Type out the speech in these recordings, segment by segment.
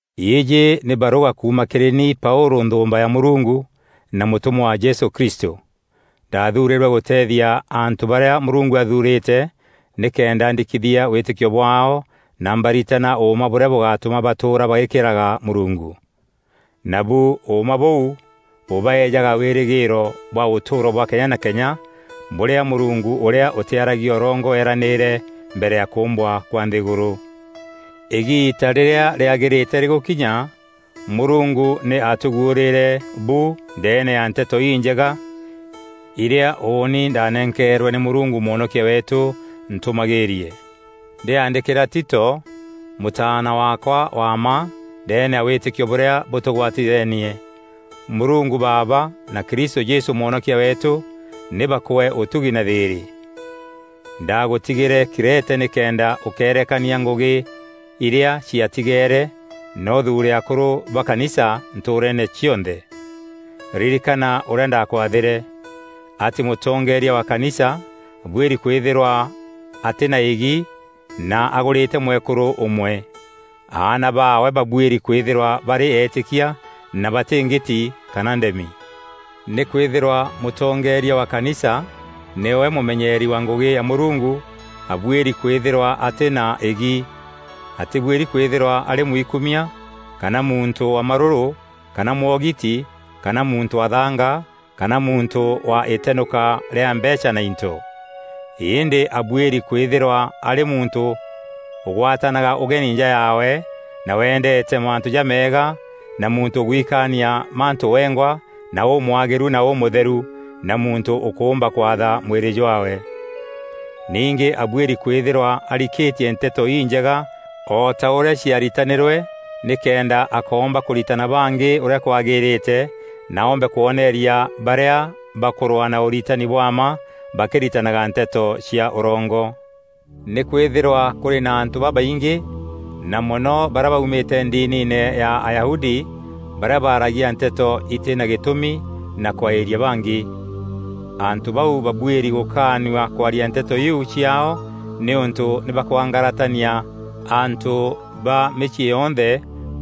Îîjî nî barûga kuuma kîrî ni Paûlû nthûûmba ya Mûrungu na mûtûmwa wa Jesû Kristû. Ndaathuurîrwe gûteethia antû barîa Mûrungu athurîte nîkenda ndikithia wîtîkio bwaao na mbaritana ûûma bûrîa bûgatûma batûûra bagîkîraga Mûrungu. Nabu ûûma bûu bûbaeejaga wîrîgîîro bwa ûtûûro bwa kenya na kenya bûrîa Mûrungu ûrîa ûtîaragia ûrongo eeranîîre mbere ya kûûmbwa kwa nthîgûrû. Îgiita rîrîa rîaagîrîte rîgûkinya, Mûrungu nî aatûguûrîîre bu ndeene ya Nteto Injega îrîa ûûni ndaanenkeerwe nî Mûrungu Mwonokia weetû ntûmagîîrie. Ndîaandîkîra Tito, mûtaana waakwa wa mma ndeene ya wîtîkio bûrîa bûtûgwatithenie. Mûrungu Baaba na Kristû Jesû Mwonokia weetû nî bakwee ûtugi na thîîrî. Ndaagûtigîre Krete nîkenda ûkeerekania ngûgî irîa ciatigeere na ûthuure akûrû ba kanisa ntûûreene cionthe. Ririkana ûrîa ndaakwathîre: atî mûtongeeria wa kanisa abuîri kwîthîrwa atî na îgi na agûrîte mwekûrû ûmwe. Aana baawe babuîri kwîthîrwa barî eetîkia na batî ngîti kana ndemi. Nîkwîthîrwa mûtongeeria wa kanisa nîwe mûmenyeeri wa ngûgî ya Mûrungu, abuîri kwîthîrwa atî na îgi. Atîbuîri kwîthîrwa arî mwikumia kana muntû wa marûrû kana mwogiti kana muntû wa thanga kana muntû wa îtenûka rîa mbeecha na into. Îndî abuîri kwîthîrwa arî muntû ûgwatanaga ûgeni nja yaawe na wendeete mantû jameega na muntû ûgwikaania mantû wengwa na ûmwagîru na ûmûtherû na muntû ûkûûmba kwatha mwîrî jwaawe. Ningî abuîri kwîthîrwa arikîtie Nteto Injega o ta ûrîa ciaaritanîrwe nîkenda akoomba kûritana bangî ûrîa kwagîrîte na oombe kwoneeria barîa bakûrwaa na ûritani bwa mma bakîritanaga nteto cia ûrongo. Nîkwîthîrwa kûrî na antû babaingî, na mono barîa baumîte ndiniine ya Ayahudi, barîa baragia nteto itî na gîtûmi na kwaîria bangî. Antû bau babuîri gûkaanua kwaaria nteto iu ciaao nîûntû nî bakwangaratania antû ba mîciî yonthe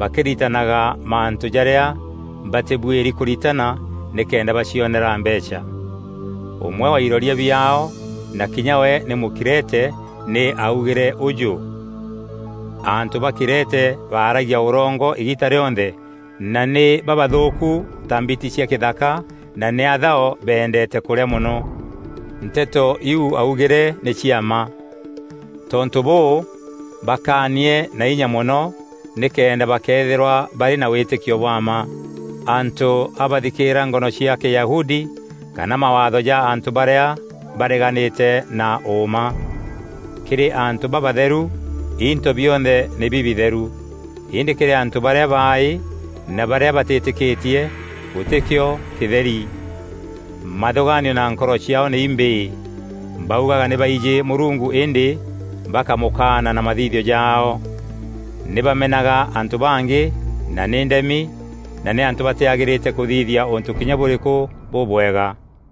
bakîritanaga mantû jaarîa batîbuîri kûritana nîkenda bacionera mbeecha. Ûmwe wa iroria biaao, na kinya we nî Mûkrete, nî aaugîre ûjû, “Antû ba Krete baaragia ûrongo îgiita rîonthe na nî babathûûku ta mbiti cia kîthaka na nî athao bendeete kûrîa mono.” Nteto iu augîre nî cia mma. Tontû bûû bakaanie na inya mono nîkenda bakeethîrwa barî na wîtîkio bwa mma antû a bathikîîra ngono cia Kîyahudi kana mawaatho ja antû barîa bareganîte na ûûma. Kîrî antû babatheru, into bionthe nî bibitheru, îndî kîrî antû barîa baaî na barîa batîtîkîtie, gûtîkîo kîtheri. Mathûgaanio na nkoro ciaao nî imbîî. Baugaga nî baijî Mûrungu îndî bakamûkaana na mathithio jaao. Nî bamenaga antû bangî, na nî ndemi, na nî antû batîagîrîte kûthithia ûntû kinya bûrîkû bûbwega.